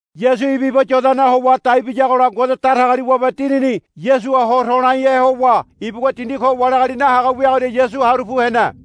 Yasu ibu iba Yodanaha howa dai biyagola Ngode Datagaliwabe Dinini Yasuha ho to̱laihe howa ibugua dindi ko wali agali nahaga wiagoria Yasu haru pu hene.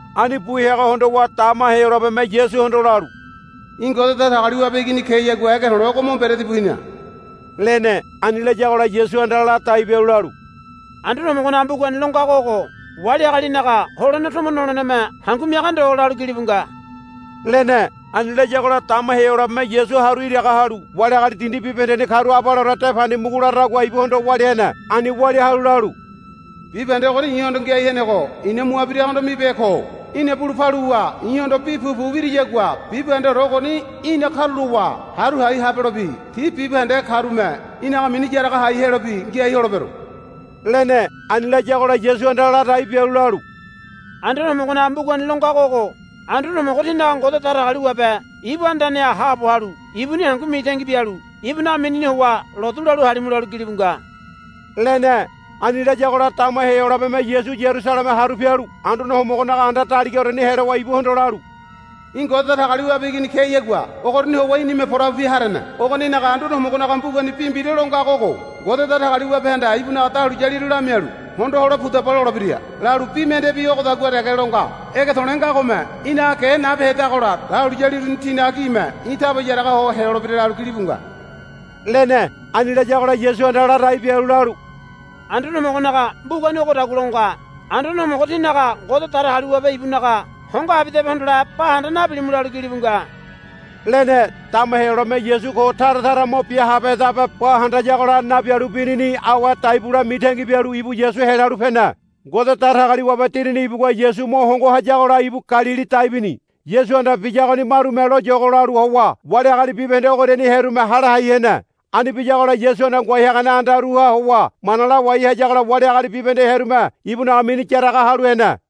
Ani bu heago hondowa dama Heyolabeme Yasuhondo lalu, Í̠ Ngode Datagaliwabe Igini keyagua ege to̱le̱ ogo mo mberedi bu hina, lene. Ani layagola Yasuhanda ladai bialu lalu, Anduane Homogonaga mbugani lo ngago ogo, Wali agalinaga holene tomo noleneme hangu miaga ndo, lalu gilibu nga, lene. Ani layagola dama Heyolabeme Yasu haru iraga halu wali agali dindi bibahendeni karu abaleore de pandi mugu laradagua ibuhondo walia hene. Ani walia halu lalu, Bibahende ogoni i̱hondo ngiai henego i̱na mua biragohondo mibehe ko. Í̠na bulu paluwa i̱hondo bi pupu wiriyagua bibahendeore ogoni í̠na karulowa haru hai habelobi ti bibahende karume í̠naga mini yaraga hai helobi ngiai holebero, lene. Ani layagola Yasuhanda ladai bialu lalu, Anduane Homogonaga mbugani lo ngago ogo, Anduane Homogo tínaga Ngode Datagaliwabe ibu andaneha haabo halu ibuni hangu mitangi bialu ibunaga minini howa lotu lalu halimu, lalu gilibu nga, lene. Ani layagola dama Heyolabeme Yasu Yarusaleme haru pialu Anduane Homogonaga anda daligaoreni helowa ibuhondo lalu, Í̠ Ngode Datagaliwabe Igini keyagua ogoriani howa í̠nime porabupe harene. Ogoninaga Anduane Homogonaga mbugani bi mbira lo ngago ogo, Ngode Datagaliwabehanda ibunaga dahuliyaliru lamialu hondo hole pudaba lolebira, lalu bi mendebi ogodagua dege lo nga, Ege to̱le̱ ngagome í̠naga ge nabehedagola dahuliyali uruni tinaga gime í̠ taba yaraga holebira, lalu gilibu nga, lene. Ani layagola Yasuhanda ladai bialu lalu, Anduane Homogonaga mbugani ogodagua lo nga, Anduane Homogo tínaga Ngode Datagaliwabe ibunaga hongo abidabe hondole bahanda nabilimu, lalu gilibu nga, lene. Dama Heyolabeme Yasu ko tara tara mo bia habehedabe ba handayagola nabialu binini awe dai bule mitangi bialu ibu Yasu helalu pene. Ngode Datagaliwabe Dinini ibugua Yasu mo hongo hayagola ibu Galili dai bini. Yasuhanda biyagoni marume loyogo lalu howa wali agali bibahende ogoriani hearume hale hai hene. Ani biyagola Yasuhanda ngoai hagane andaruha howa mana lawai hayagola wali agali bibahende hearume ibunaga mini yaraga halu hene.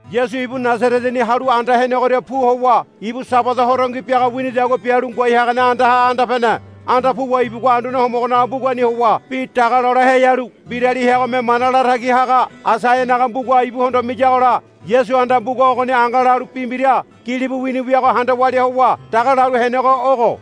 Yasu ibu Nasareteni halu anda henegoria pu howa ibu Sabada horongi biaga winidagua bialu ngoai hagane andaha anda pene. Anda puwa ibugua Anduane Homogonaga mbugani howa bi daga lole heyalu mbirali heagome mana latagi haga Aisaianaga mbuga ibuhondo miyagola Yasuhanda mbuga ogoni angalalu bi mbira gilibu wini wiago handa walia howa daga lalu henego ogo,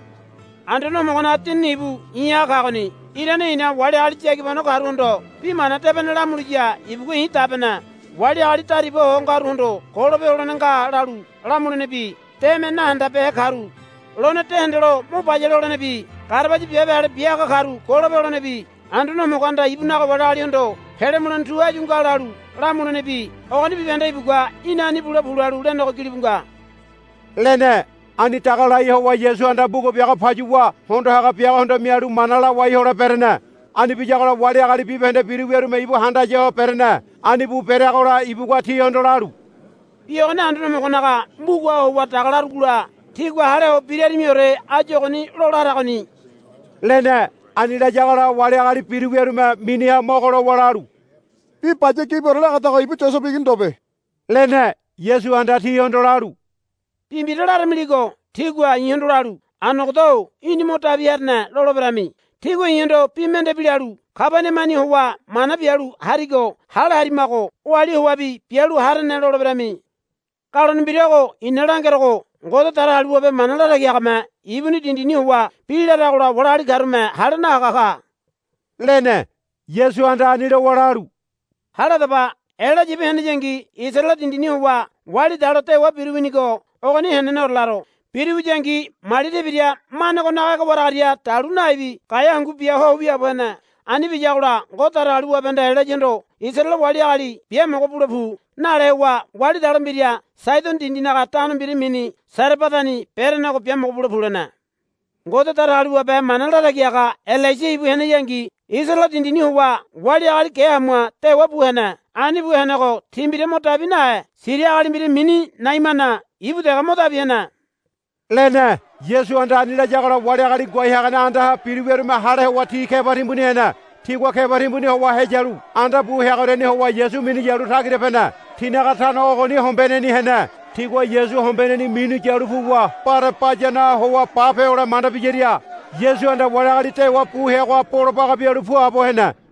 Anduane Homogonaga Dinini ibu i̱ha kagoni. Irane i̱na wali agali yagibano karuhondo bi mana debene lamuliya ibugua i̱ dabene. Wali agali dariba ho ngaruhondo golope holene nga lalu lamulenebi deme nahandabehe karu lone de hendelo mo bayale holenebi garabaya biabe ale bia haga karu golope holenebi Anduane Homogohanda ibunaga wali agalihondo pele mulene tu áyu nga lalu lamulenebi ogoni bibahende ibugua, Í̠na ani bule pu, lalu lenego gilibu nga, lene. Ani daga lai howa Yasuhanda mbuga biago payuwa hondo haga biagohondo mialu mana lawai hole berene. Ani biyagola wali agali bibahende biru wiarume ibu handaya ho berene. Ani bu bereagola ibugua tihondo lalu, Bi ogoni Anduane Homogonaga mbugaha howa daga larugola tígua hale ho birarimiore áyu ogoni lola haragoni, lene. Ani layagola wali agali biru wiarume miniha mogo lowa lalu, Bi baya gibiore lagadago ibu Yosebe igini ndobe, lene. Yasuhanda tihondo lalu, Bi mbira laramiligo tígua i̱hondo lalu, Anogoda-o í̠ni mo dabi harene, loleberami. Tígua i̱hondo bi mendebi lalu, Kabaniamani howa mana bialu harigo hale harimago oali howabi bialu harene, loleberami. Galone mbira ogo i̱na langerogo. Ngode Datagaliwabe mana latagi hagame ibuni dindini howa bi laragola wali agali karume hale nahaga ka, lene. Yasuhanda ani lowa lalu, Hale hadaba. Elaya ibu heneyangi Isaraele dindini howa wali dalo dewa biru winigo ogoni heneneore laro. Biru wiyangi mali tebira mane ogonaga ege waragaria dalu naibi gaea hangu bia ho wiaabo hene. Ani biyagola Ngode Datagaliwabehanda Elayahondo, Isaraele wali agali biamogo bule pu, nale howa wali dalo mbira Saidono dindinaga tano mbira mini Sarebadani berenego, Biamogo bule pu, lene. Ngode Datagaliwabe mana latagi haga Elaisa ibu heneyangi Isaraele dindini howa wali agali ge hamua dewa bu hene. Ani bu henego ti mbira mo dabi nahe Siria agali mbira mini Naimana ibu dege mo dabi hene, lene. Yasuhanda ani layagola wali agali ngoai hagane andaha biru wiarume hale howa ti keba timbuni hene. Tigua keba timbuni howa heyalu anda bu heagoriani howa Yasu minu yalu tagira pene. Tinaga tano ogoni hombeneni hene. Tigua Yasu hombeneni minu yalu puwa bare bayanoha howa bape hole manda biyaria Yasuhanda wali agali dewa bu heagoha bolo baga bialu puabo hene.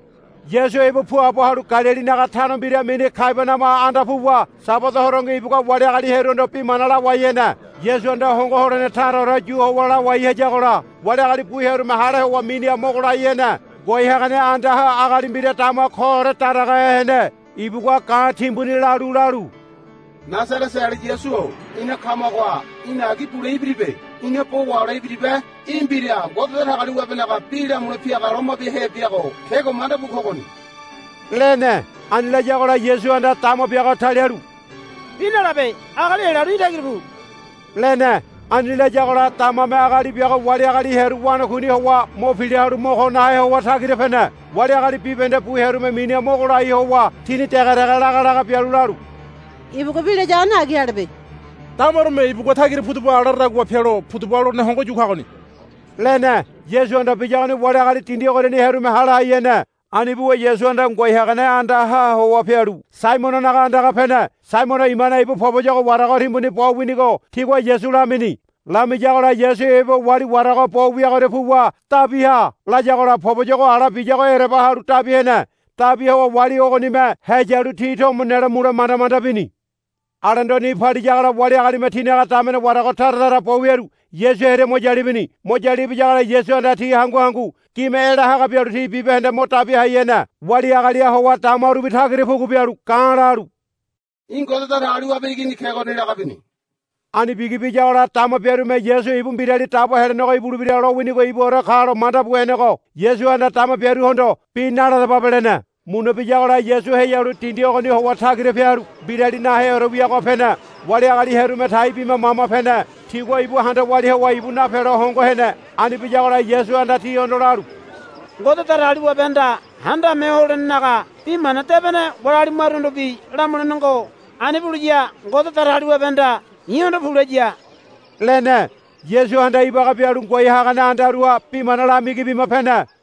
Yasu ibu puabo halu Galilinaga tano mbira mini Kabaniama anda puwa Sabada horongi ibugua wali agali hearuhondo bi mana lawai hene. Yasuhanda hongo holene taraore yu howa lawai hayagola wali agali bu hearume hale howa miniha mogo lai hene. Ngoai hagane andaha agali mbira dama koore daragahe hene. Ibugua ga̱ timbuni lalu lalu, Nasareteali Yasu-o ina kamagoha í̠na agi bule ibiribe. Ina bo wahole ibiribe. Í̠ mbira Ngode Datagaliwabenaga bi lamule piaga loma biahe biago kego mandabu kogoni, lene. Ani layagola Yasuhanda dama biago talialu, Bi nalabe. Agali helalu í̠ tagira pu, lene. Ani layagola damame agali biago wali agali hearu wanakuini howa mo pila halu mo ko nahe howa tagira pene. Wali agali bibahende bu hearume miniha mogo lai ho howa tini dege dege laga laga bialu lalu, Ibugua bi layagoni agi alebe. Damarume ibugua tagira pudaba laradagua pelo pudaba lolene hongo yu kagoni, lene. Yasuhanda biyagoni wali agali dindi ogoriani hearume hale hai hene. Ani buwa Yasuhanda ngoai hagane andaha howa pialu Saimononaga andaga pene. Saimono imane ibu poboyogo warago timbuni bo winigo tigua Yasu lamini. Lamiyagola Yasu ibu wali warago bo wiagoria puwa, Dabi ha, layagola poboyogo ala biyago ereba halu dabi hene. Dabi howa wali ogonime heyalu ti tomo nelo mule manda manda bini. Alendo ni paliyagola wali agalime tinaga damene warago tara tara bo wiaru Yasu hearia mo yalu ibini. Mo yalu ibiyagola Yasuhanda ti hangu hangu gime ela haga bialu ti bibahende mo dabi hai hene. Wali agaliha howa damarubi tagira pugu bialu ga̱ lalu, Í̠ Ngode Datagaliwabe Igini kegoni, laga bini. Ani bigi biyagola dama biarume Yasu ibu Mbirali Dabo Helenego ibulebira lowinigo ibuore kalo mandabu henego Yasuhanda dama biaruhondo, Bi naladababe, lene. Muna biyagola Yasu heyalu dindi ogoniha howa tagira pialu mbirali naheore wiagoha pene. Wali agali hearume tai bima mama pene. Tigua ibu handa walia howa ibu napelo hongo hene. Ani biyagola Yasuhanda tihondo lalu, Ngode Datagaliwabehanda Handame Ho Holenenaga Bi Mana Debene wali agali maruhondobi lamulene ngo. Ani buliya Ngode Datagaliwabehanda i̱hondo, Pu, laya, lene. Yasuhanda ibaga bialu ngoai hagane andaruha bi mana lamigi bima pene.